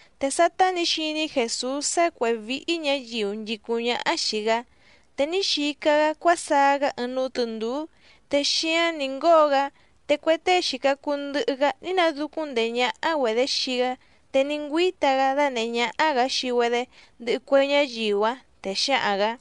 Te sátá nǐ xiní Jèsús sá cuěhé víhí ñǎyiu nchìcúⁿ ñáhá xìi‑gá, te ní xica‑gá cuásaá‑gá ɨɨⁿ núú tɨ̀ndúú te xíáⁿ nǐ ngóo‑gá, te cue tée xìca cuu ndɨhɨ‑gá ní nadúcúⁿ ndèé ñáhá‑güedě xii‑gá. Te ní ngüíta‑gá dánèhé ñáhá‑gǎ xii‑güedé ndɨhɨ cue ñáyiu‑áⁿ, te xǎhaⁿ‑gǎ: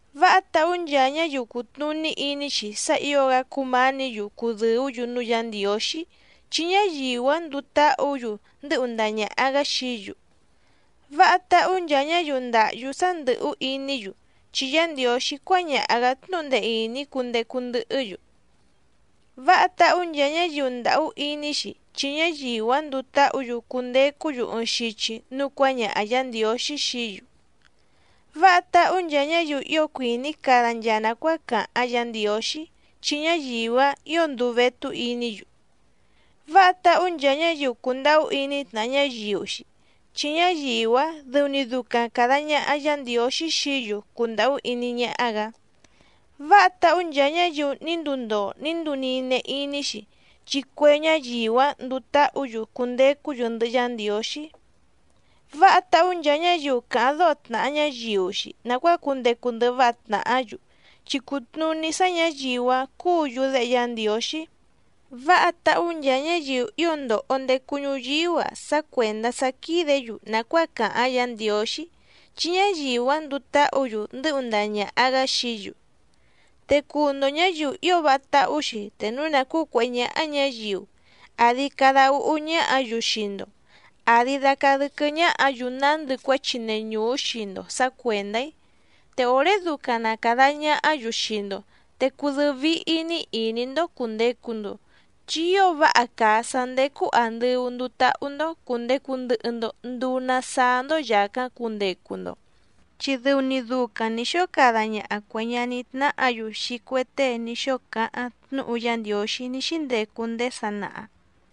—Váha táhú nchaa ñáyiu cùtnuní iní‑xi sá ǐo‑gá cúmǎnǐ‑yu cudɨ̀ú‑yu núú Yǎ Ndiǒxí, chi ñáyiu‑áⁿ nduu táhǔ‑yu ndɨ́hu ndaha ñàha‑gá xií‑yu. ’Váha táhú nchaa ñáyiu ndàhyú sá ndɨ̀hú iní‑yu, chi Yá Ndiǒxí cuáñaha‑gǎ tnúhu ndee ìní cundecu ndɨhɨ́‑yu. ’Váha táhú nchaa ñáyiu ndàhú iní‑xi, chi ñáyiu‑áⁿ nduu táhǔ‑yu cundecú‑yu ɨɨⁿ xichi núú cuǎñaha Yǎ Ndiǒxí xií‑yu. ’Váha táhú nchaa ñáyiu ío cuìní cada nchaa nàcuáa càháⁿ Yǎ Ndiǒxí, chi ñáyiu‑áⁿ ǐo nduu vétú iní‑yu. ’Váha táhú nchaa ñáyiu cùndahú iní tnàha ñáyiu‑xi, chi ñáyiu‑áⁿ dɨu‑ni ducaⁿ càda ñaha Yá Ndiǒxí xií‑yu cundàhú iní ñáhá‑gǎ. ’Váha táhú nchaa ñáyiu ní nduu ndoo ní nduu nine iní‑xi, chi cue ñáyiu‑áⁿ nduu táhǔ‑yu cundecú‑yu ndɨhɨ Yá Ndiǒxí. ’Váha táhú nchaa ñáyiu càháⁿ dóho tnàha ñáyiu‑xi nàcuáa cundecu ndɨhɨ váha tnàhá‑yu, chi cùtnuní sá ñǎyiu‑áⁿ cuú‑yu déhe Yá Ndiǒxí. ’Váha táhú nchaa ñáyiu ío ndòho ndecu ñuyíú‑a sá cuèndá sá quídě‑yu nàcuáa càháⁿ Yǎ Ndiǒxí, chi ñáyiu‑áⁿ nduu táhǔ‑yu ndɨ́hu ndaha ñàha‑gá xií‑yu. ’Te cùu‑ndo ñáyiu ío váha táhú‑xi te núu na cǔcuèhé ñáhá ñǎyiu, àdi cada úhú ñáhǎ‑yu xii‑ndo, àdi dacaa dɨ́quɨ́ ñáhǎ‑yu nándɨ cuéchi neñùú xii‑ndo sǎ cuèndá‑í. Te òré ducaⁿ na càda ñahá‑yu xii‑ndo te cudɨ́ɨ́ víhí‑ní ìní‑ndó cùndecu‑ndo, chi ío váha càa sá ndécú àndɨu nduu táhú‑ndó cùndecu ndɨhɨ‑ndo nduu na saá‑ndó yàcáⁿ cundecu‑ndo, chi dɨu‑ni ducaⁿ nǐ xóo cada ñaha cuè ñaní tnáhǎ‑yu xii cue tée ní xóo cáháⁿ tnúhu Yá Ndiǒxí ní xíndecu ndéé sanaha.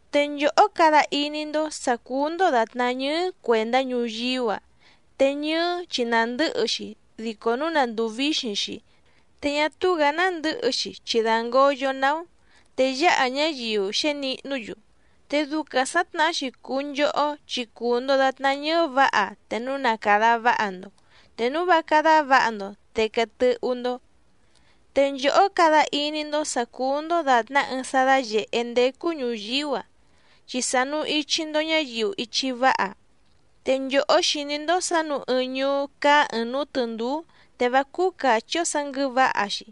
’Te nchòhó cada iní‑ndó sǎ cúú‑ndó dàtná ñɨ́ɨ́ cuèndá ñuyíú‑a. Te ñɨ́ɨ́ chi nàndɨ́hɨ‑xi dico núu na ndùu víxiⁿ‑xi, te ñá túú‑gǎ nándɨ̌hɨ‑xi chi dǎngoyo‑ná‑ó, te yǎha ñáyiu xěnihnú‑yu. Te ducaⁿ sǎtnahá‑xi cùu nchohó chi cùu‑ndo datná ñɨ́ɨ́ vǎha te núu na càda váha‑ndo, te núu vá cádá vǎha‑ndo te quee tɨ́hú‑ndó. ’Te nchòhó cada iní‑ndó sǎ cúú‑ndó dàtná ɨɨⁿ sá dáyèhé ndécú ñùyíú‑a, chi sànu ichi‑ndo ñáyiu ichi váha. Te nchòhó xìní‑ndó sǎ nǔu ɨɨⁿ ñuú cáá ɨ̀ɨⁿ núú tɨ̀ndúú te vá cúú càchí‑ó sǎ nguɨ̌vǎha‑xi.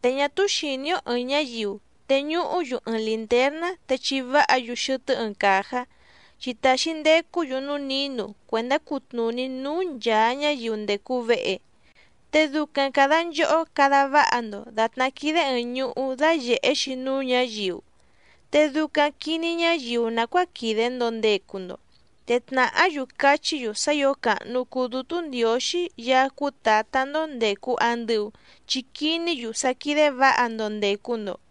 Te ñá túú xìní‑ó ɨ̀ɨⁿ ñáyiu teñuhú‑yu ɨɨⁿ lìntérná te chiváha‑yu xɨtɨ́ ɨɨⁿ càjá, chi tàxi ndecú‑yu núú nǐnu cuèndá cutnùní núú nchàa ñáyiu ndècu vehe. Te ducaⁿ càda nchohó cada váha‑ndo dàtná quídé ɨ̀ɨⁿ ñuhú dayèhe‑xi núú ñǎyiu, te ducaⁿ quìní ñáyiu nàcuáa quìde‑ndo ndecu‑ndo, te tnàhá‑yu cachí‑yu sá ǐo càhnu cuu Dútú Ndiǒxí Yaá cúú Tǎtá‑ndó ndècu andɨu chi quiní‑yu sá quídé vǎha‑ndo ndècu‑ndo.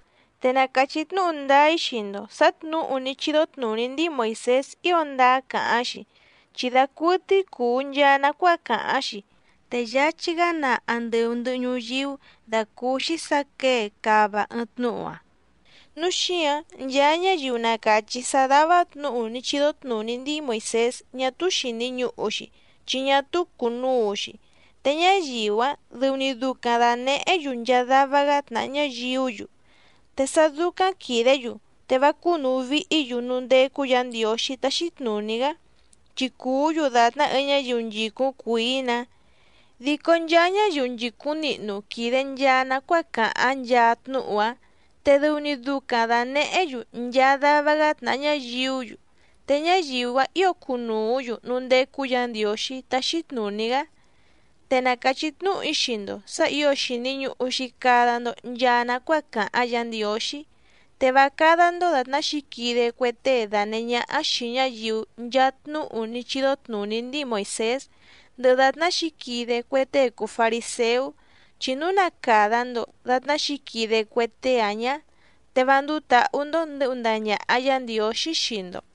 Te na càchí tnúhu ndáá‑í xii‑ndo sǎ tnǔhu ní chídó tnùní ndíi Moìsés ío ndáá càháⁿ‑xi, chi dacuɨtɨ́í cùu nchaa nacuáa càháⁿ‑xi. Te yáchí‑gá naa andɨu ndɨ̀hɨ ñuyíú dàcúúxí sǎ quěe cáva ɨɨⁿ tnúhu‑áⁿ. Núu xíǎⁿ nchaa ñáyiu na càchí sá dává tnǔhu ní chídó tnùní ndíi Moìsés ñá túú xìni ñuhu‑xi chi ñá túú cùnuu‑xi, te ñáyiu‑áⁿ dɨu‑ni ducaⁿ dànehé‑yu nchaa dava‑gá tnàha ñáyiú‑yu, te sá dúcáⁿ quìdé‑yu te vá cúnùu vihí‑yu núú ndécú Yǎ Ndiǒxí táxí tnùní‑gá, chi cuú‑yu dàtná ɨɨⁿ ñáyiu nchìcúⁿ cuìí‑nǎ. Dico nchaa ñáyiu nchìcúⁿ nihnu quìde nchaa nacuáa càháⁿ nchaa tnúhu‑áⁿ, te dɨu‑ni ducaⁿ dànehé‑yu nchaa dava‑gá tnàha ñáyiú‑yu, te ñáyiu‑áⁿ ǐo cunùú‑yu núú ndécú Yǎ Ndiǒxí táxí tnùní‑gá. Te na càchí tnúhu‑í xii‑ndo sǎ ǐo xìni ñuhu‑xi cada‑ndo nchaa nacuáa càháⁿ Yǎ Ndiǒxí, te vá cádá‑ndó dàtná xǐquide cue tée dànehé ñáhá xìi ñáyiu nchaa tnúhu ní chídó tnùní ndíi Moìsés, ndɨhɨ dàtná xǐquide cue tée cùu fariséú, chi núu na càda‑ndo datná xǐquide cue tée‑áⁿ ñá, te vá ndúú tǎhú‑ndó ndɨ̌hu ndaha ñàha Yá Ndiǒxí xii‑ndo.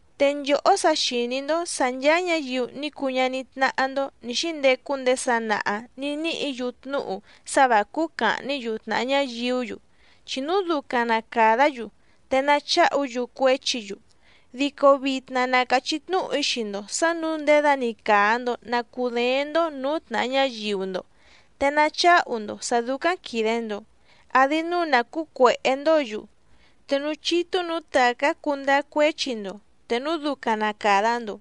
’Te nchòhó sa xìní‑ndó sǎ ncháá ñǎyiu ní cuu ñaní tnáhá‑ndó nǐ xíndecu ndéé sanaha nǐ níhǐ‑yu tnúhu sá vǎ cúú càhní‑yu tnàha ñáyiú‑yu, chi núu ducaⁿ na càdá‑yu te nacháhu‑yu cuéchi‑yu. Dico vitna na càchí tnúhu‑í xii‑ndo sǎ nǔu ndědani càa‑ndo na cudééⁿ‑ndó nǔú tnàha ñáyiu‑ndo, te nacháhu‑ndo sǎ dúcáⁿ quìde‑ndo, àdi núu na cǔcuèhé‑ndǒ‑yu te núú chítú nǔú tàcá cundáá cuéchi‑ndo te núu ducaⁿ na càda‑ndo,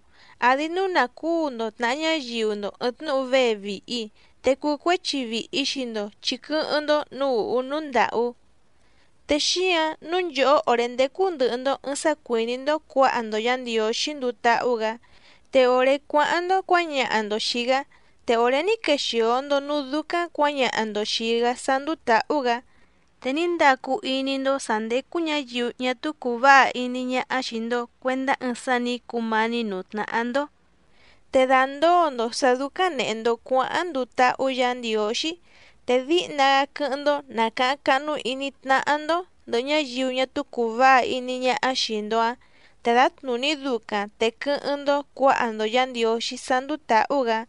àdi núu nà cúu‑ndo tnàha ñáyiu‑ndo ɨ̀ɨⁿ tnúhu vée vìhi, te cucuéchi vìhi xii‑ndo chi quɨ́hɨ́ⁿ‑ndó nǔú ùhú núú ndàhú. ’Te xíǎⁿ nǔu nchòhó òré ndécú ndɨ̀hɨ‑ndo ɨɨⁿ sá cuìní‑ndó cuǎha‑ndo Yǎ Ndiǒxí nduu táhú‑gǎ, te òré cuáháⁿ‑ndó cuǎñaha‑ndo xìi‑gá, te òré ní quexìo‑ndo núú dúcáⁿ cuǎñaha‑ndo xìi‑gá sá ndúú tǎhú‑gǎ, te ní ndacu iní‑ndó sǎ ndécú ñǎyiu ñá túú cùu váha iní ñáhá xìi‑ndo cuendá ɨɨⁿ sá nǐ cumání nǔú tnáhá‑ndó. Te dàndóo‑ndo sǎ dúcáⁿ nèhe‑ndo cuáháⁿ nduu táhú Yǎ Ndiǒxí, te díhna‑gá quɨ́hɨ́ⁿ‑ndó nàcaháⁿ cáhnú ìní tnáhá‑ndó ndɨ̀hɨ ñáyiu ñá túú cùu váha iní ñáhá xìi‑ndo‑áⁿ, te dǎtnùní ducaⁿ te quɨ́hɨ́ⁿ‑ndó cuǎha‑ndo Yǎ Ndiǒxí sá ndúú tǎhú‑gǎ.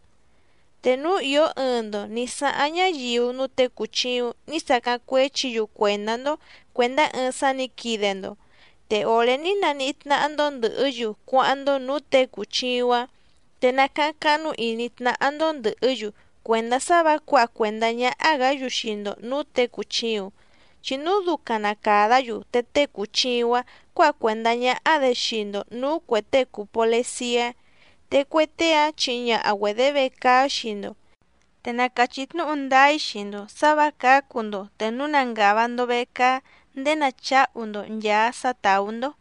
’Te núu ìó ɨɨⁿ‑ndo nǐ sáháⁿ ñáyiu núú těe cùchiuⁿ ní sacáⁿ cuéchi‑yu cuèndá‑ndó cuèndá ɨɨⁿ sá nǐ quide‑ndo, te òré ní naníhí tnáhá‑ndó ndɨ̀hɨ́‑yu cuáháⁿ‑ndó nǔú těe cùchiuⁿ‑áⁿ, te nacáháⁿ cáhnú ìní tnáhá‑ndó ndɨ̀hɨ́‑yu cuèndá sá vǎ cuǎha cuèndá ñáhá‑gǎ‑yu xii‑ndo nǔú tě cùchiuⁿ, chi núu ducaⁿ na càdá‑yu te tée cùchiuⁿ‑áⁿ cuǎha cuèndá ñáhá‑dě xii‑ndo nǔú cuè tée cùu poleciá, te cue tée‑áⁿ chihi ñaha‑güedě vecaá xii‑ndo. Te na càchí tnúhu ndáá‑í xii‑ndo sǎ vǎ cǎcu‑ndo te núu na ngàva‑ndo vecaá ndéé nacháhu‑ndo nchàa sá tàú‑ndó.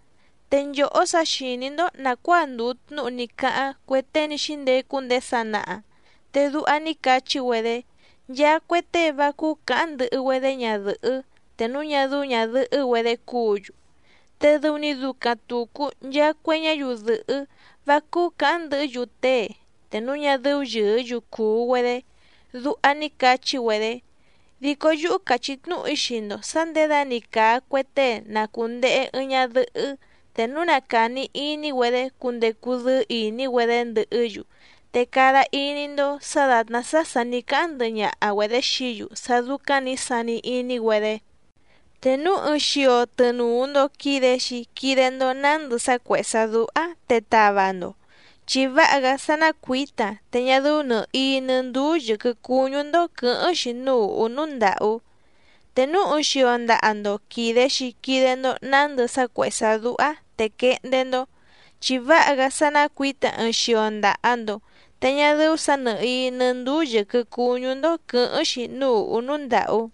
’Te nchòhó sa xìní‑ndó nàcuáa ndùu tnúhu ní cáháⁿ cue tée ní xíndecu ndéé sanaha, te duha ní cachí‑güedé: “Nchaa cue tée vá cúú cǎháⁿ ndɨhɨ‑güedé ñadɨ̀hɨ́ te núu ñá dɨ́ú ñàdɨhɨ́‑güedé cúǔ‑yu, te dɨu‑ni ducaⁿ tùcu nchaa cue ñáyiu dɨ̀hɨ́ vá cúú cǎháⁿ ndɨhɨ́‑yu tée te núu ñá dɨ́ú yɨ̀ɨ́‑yu cùu‑güedé”, duha ní cachi‑güedé. Dico yúhú càchí tnúhu‑í xii‑ndo sǎ nděda‑ni càa cue tée na cùndehe ɨɨⁿ ñadɨhɨ́ te núu na càni iní‑güedé cundecu dɨ́ɨ́ ìní‑güedé ndɨhɨ́‑yu te cada iní‑ndó sǎ dàtná sá sà ní cáháⁿ ndɨhɨ ñaha‑güedě xií‑yu sá dúcáⁿ nǐ sani iní‑güedé. ’Te núu ɨɨⁿ xio tɨnùu‑ndo quide‑xi quide‑ndo nándɨ sá cuèhé sá dúhá te tava‑ndo, chi váha‑gá sá ná cuǐta te ñá dɨ́ú nɨ̀hií nɨ́ ndúú yɨ̀quɨ cuñú‑ndó quɨ̌hɨ́ⁿ‑xi núú ùhú núú ndàhú. Te núu ɨɨⁿ xio ndaha‑ndo quìde‑xi quide‑ndo nándɨ sá cuèhé sá dúhá te quehndé‑ndó, chi váha‑gá sá ná cuǐta ɨɨⁿ xio ndaha‑ndo te ñá dɨ́ú sǎ nɨ̀hií nɨ́ ndúú yɨ̀quɨ cuñú‑ndó quɨ̌hɨ́ⁿ‑xi núú ùhú núú ndàhú.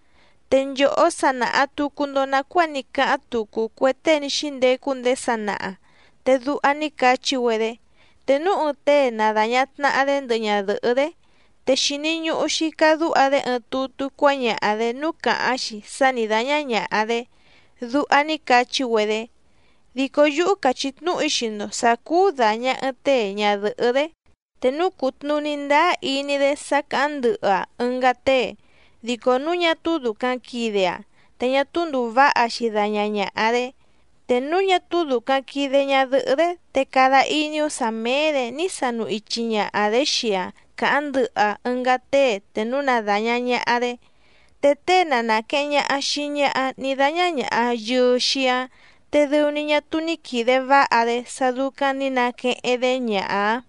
’Te nchòhó sa nàha tucu‑ndo nacuáa ní cáháⁿ tucu cue tée ní xíndecu ndéé sanaha, te duha ní cachí‑güedé: “Te núu ɨɨⁿ tée na dàña tnaha‑dé ndɨhɨ ñadɨ̀hɨ́‑dé, te xìni ñuhu‑xi cadúha‑dé ɨɨⁿ tutú cuáñaha‑dě núú càháⁿ‑xi sá nǐ dáñá ñàha‑dé”, duha ní cachí‑güedé. Dico yúhú càchí tnúhu‑í xii‑ndo sǎ cúú dàña ɨɨⁿ tée ñadɨ̀hɨ́‑dé, te núu cùtnuní ndáá iní‑dé sá càháⁿ ndɨhɨ‑aⁿ ɨngá tée. Dico núu ñá túú dùcaⁿ quide‑aⁿ te ñá túú ndùu váha‑xi daña ñàha‑dé. Te núu ñá túú dùcaⁿ quide ñadɨhɨ́‑dé, te cada iní‑ó sǎ méé‑dě ní sanu ichi ñaha‑dě xii‑aⁿ cáháⁿ ndɨhɨ‑aⁿ ɨngá tée te núu na dàña ñaha‑dé. Te tée na nàqueheⁿ ñaha xii ñaha ní dáñá ñàha yɨɨ‑xi‑áⁿ, te dɨu‑ni ñá túú ní quìde váha‑dé sá dúcáⁿ nǐ naqueheⁿ‑dé ñaha‑áⁿ.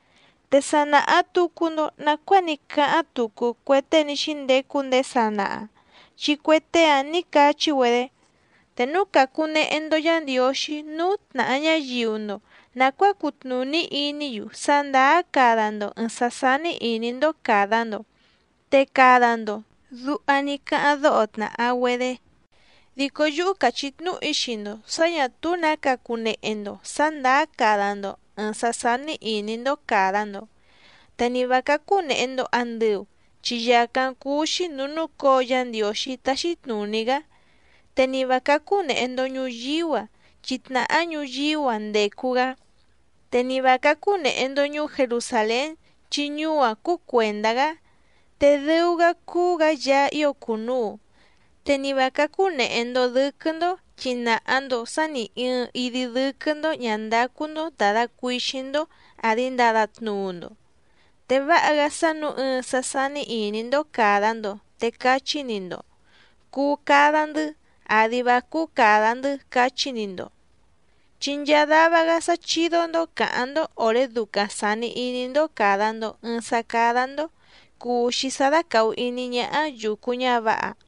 ’Te sa nàha tucu‑ndo nacuáa ní cáháⁿ tucu cue tée ní xíndecu ndéé sanaha, chi cue tée‑áⁿ nǐ cachí‑güedé: “Te núu càcunehe‑ndo Yá Ndiǒxí núú tnàha ñáyiu‑ndo nàcuáa cutnùní iní‑yu sá ndàá cada‑ndo ɨ̀ɨⁿ sá sání ìní‑ndó càda‑ndo, te cada‑ndo”, duha ní cáháⁿ dóho tnàha‑güedé. Dico yúhú càchí tnúhu‑í xii‑ndo sǎ ñà túú nǎ cacunehe‑ndo sǎ ndàá cada‑ndo ɨ̀ɨⁿ sá sání ìní‑ndó càda‑ndo. Te ni vǎ cácú nèhe‑ndo andɨu chi yàcáⁿ cúú‑xí nǔú núcǒo Yá Ndiǒxí táxí tnùní‑gá. Te ni vǎ cácú nèhe‑ndo ñuyíú‑a, chi tnàhá ñuyíú‑a ndècu‑gá, te ni vǎ cácú nèhe‑ndo ñuú Jerusàlén chi ñuú‑áⁿ cúú cuèndá‑gá, te dɨu‑gá cúú‑gǎ Yaá ío cùnuu. Te ni vǎ cácú nèhe‑ndo dɨ́quɨ́‑ndó chi nàha‑ndo sá nì ɨɨⁿ idi dɨ́quɨ́‑ndó ñǎ ndácú‑ndó ndàda cuixíⁿ‑ndó àdi ndada tnuu‑ndo. Te váha‑gá sá nǔu ɨɨⁿ sá sání ìní‑ndó càda‑ndo, te cachí‑ni‑ndo: “Cuu cada‑ndɨ́, àdi vá cúú càda‑ndɨ́”, cachí‑ni‑ndo. Chi nchaa dava‑gá sá chídó‑ndó càháⁿ‑ndó òré ducaⁿ sàni iní‑ndó càda‑ndo ɨɨⁿ sá cádá‑ndó cùu‑xi sá dácàhu iní ñáhá yùcu ñávǎha.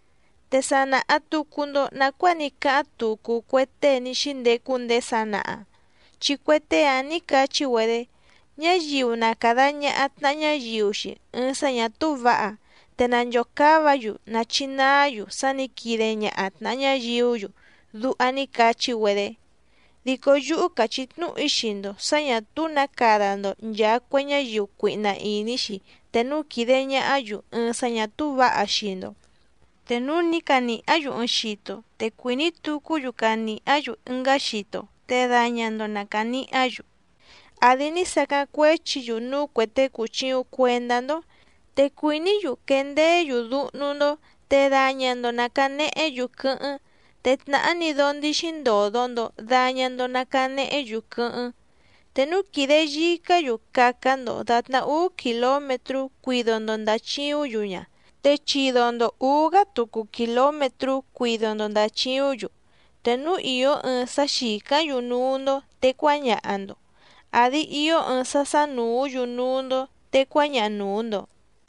’Te sa nàha tucu‑ndo nacuáa ní cáháⁿ tucu cue tée ní xíndecu ndéé sanaha, chi cue tée‑áⁿ nǐ cachí‑güedé: “Ñáyiu na càda ñaha tnaha ñáyiu‑xi ɨɨⁿ sá ñà túú vǎha, te nanchòcáva‑yu nachinaá‑yu sá nǐ quide ñaha tnàha ñáyiú‑yu”, duha ní cachí‑güedé. Dico yúhú càchí tnúhu‑í xii‑ndo sǎ ñà túú nǎ cada‑ndo nchàa cue ñáyiu cuihna ìní‑xi te núu quìde ñahá‑yu ɨɨⁿ sá ñà túú vǎha xii‑ndo. Te núu ní canìhá‑yu ɨɨⁿ xito te cuìní tucú‑yu canìhá‑yu ɨngá xito te daña‑ndo na cànihá‑yu. Àdi ní sacáⁿ cuéchi‑yu núú cuè tée cùchiuⁿ cuendá‑ndó, te cuìní‑yu quendeé‑yu dúhnú‑ndó te daña‑ndo na cànehé‑yu quɨ́hɨ́ⁿ, te tnàhá‑ni dóó ndíxí ndòdo‑ndo daña‑ndo na canehé‑yu quɨ́hɨ́ⁿ. Te núu quìde yicá‑yu caca‑ndo dàtná úú kìlómetrú cuido‑ndo ndàchiúⁿ‑yu ña, te chido‑ndo ǔú‑gá tucu kìlómetrú cuido‑ndo ndàchiúⁿ‑yu. Te núu ìó ɨɨⁿ sá xìcáⁿ‑yu núú‑ndó te cuáñaha‑ndo, àdi ió ɨɨⁿ sá sánùú‑yu núú‑ndó te cuáñaha nùu‑ndo.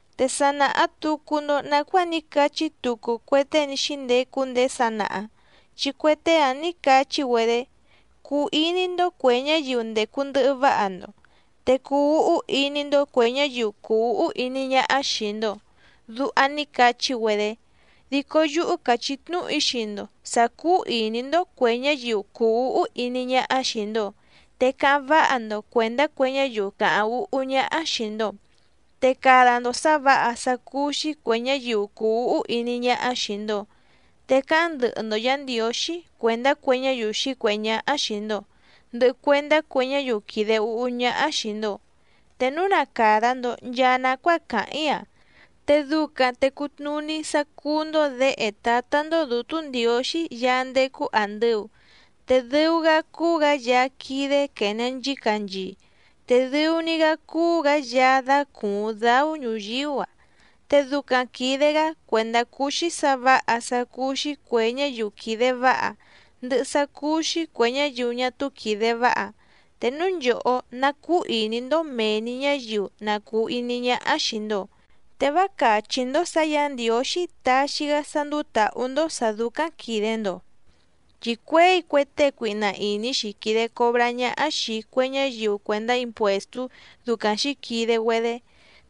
’Te sa nàha tucu‑ndo nacuáa ní cachí tucu cue tée ní xíndecu ndéé sanaha, chi cue tée‑áⁿ nǐ cachí‑güedé: “Cuu iní‑ndó cuè ñáyiu ndècu ndɨhɨ váha‑ndo, te cuu úhú iní‑ndó cuè ñáyiu cùu úhú iní ñáhá xìi‑ndo”, duha ní cachí‑güedé. Dico yúhú càchí tnúhu‑í xii‑ndo sǎ cúú ìní‑ndó cuè ñáyiu cùu úhú iní ñáhá xìi‑ndo, te cáháⁿ váha‑ndo cuèndá cue ñáyiu càháⁿ úhú ñáhá xìi‑ndo, te cada‑ndo sǎ vǎha sá cúú‑xí cuè ñáyiu cùu úhú iní ñáhá xìi‑ndo, te cáháⁿ ndɨhɨ‑ndo Yǎ Ndiǒxí cuèndá cue ñáyiu xǐcuèhé ñáhá xìi‑ndo, ndɨhɨ cuèndá cue ñáyiu quìde úhú ñáhá xìi‑ndo. Te núu na càda‑ndo nchaa nacuáa càháⁿ‑í‑a, te ducaⁿ te cutnùní sá cúú‑ndó děhe Tǎtá‑ndó Dǔtú Ndiǒxí Yaá ndécú àndɨu. Te dɨu‑gá cúú‑gǎ Yaá quídé quène nchícanchii, te dɨu‑ni‑gá cúú‑gǎ Yaá dácùuⁿ dáú ñuyíú‑a, te ducaⁿ quìde‑gá cuèndá cuu‑xi sá vǎha sá cúú‑xí cuè ñáyiu quìde váha, ndɨhɨ sá cúú‑xí cuè ñáyiu ñá túú quìde váha. Te núu nchòhó ná cúú ìní‑ndó mèe‑ni ñáyiu na cùu iní ñáhá xìi‑ndo, te vá càchí‑ndó sǎ Yǎ Ndiǒxí taxi‑gá sá ndúú tǎhú‑ndó sǎ dúcáⁿ quìde‑ndo, chi cuěi cue tée cuihna ìní‑xi quìde cobrá ñáhá xìi cue ñáyiu cuèndá impuèstú ducaⁿ xǐquide‑güedé.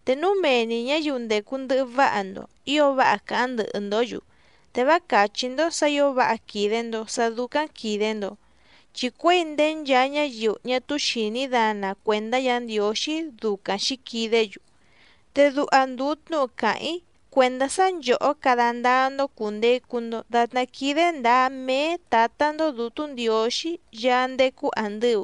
Te núu mee‑ni ñǎyiu ndècu ndɨhɨ váha‑ndo ǐo váha cáháⁿ ndɨhɨ‑ndǒ‑yu, te vá càchí‑ndó sǎ ǐo váha quìde‑ndo sá dúcáⁿ quìde‑ndo, chi cuěi ndéé nchaa ñáyiu ñá túú xìní dana cuèndá Yǎ Ndiǒxí ducaⁿ xǐquidé‑yu. Te duha ndùu tnúhu càháⁿ‑í cuèndá sá nchòhó cada ndáá‑ndó cùndecu‑ndo datná quídé ndǎá méé Tǎtá‑ndó Dǔtú Ndiǒxí Yaá ndécú àndɨu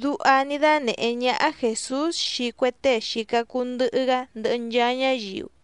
—duha ní dánèhé ñáhá Jèsús xii cue tée xìca cuu ndɨhɨ‑gá ndɨhɨ nchaa ñáyiu.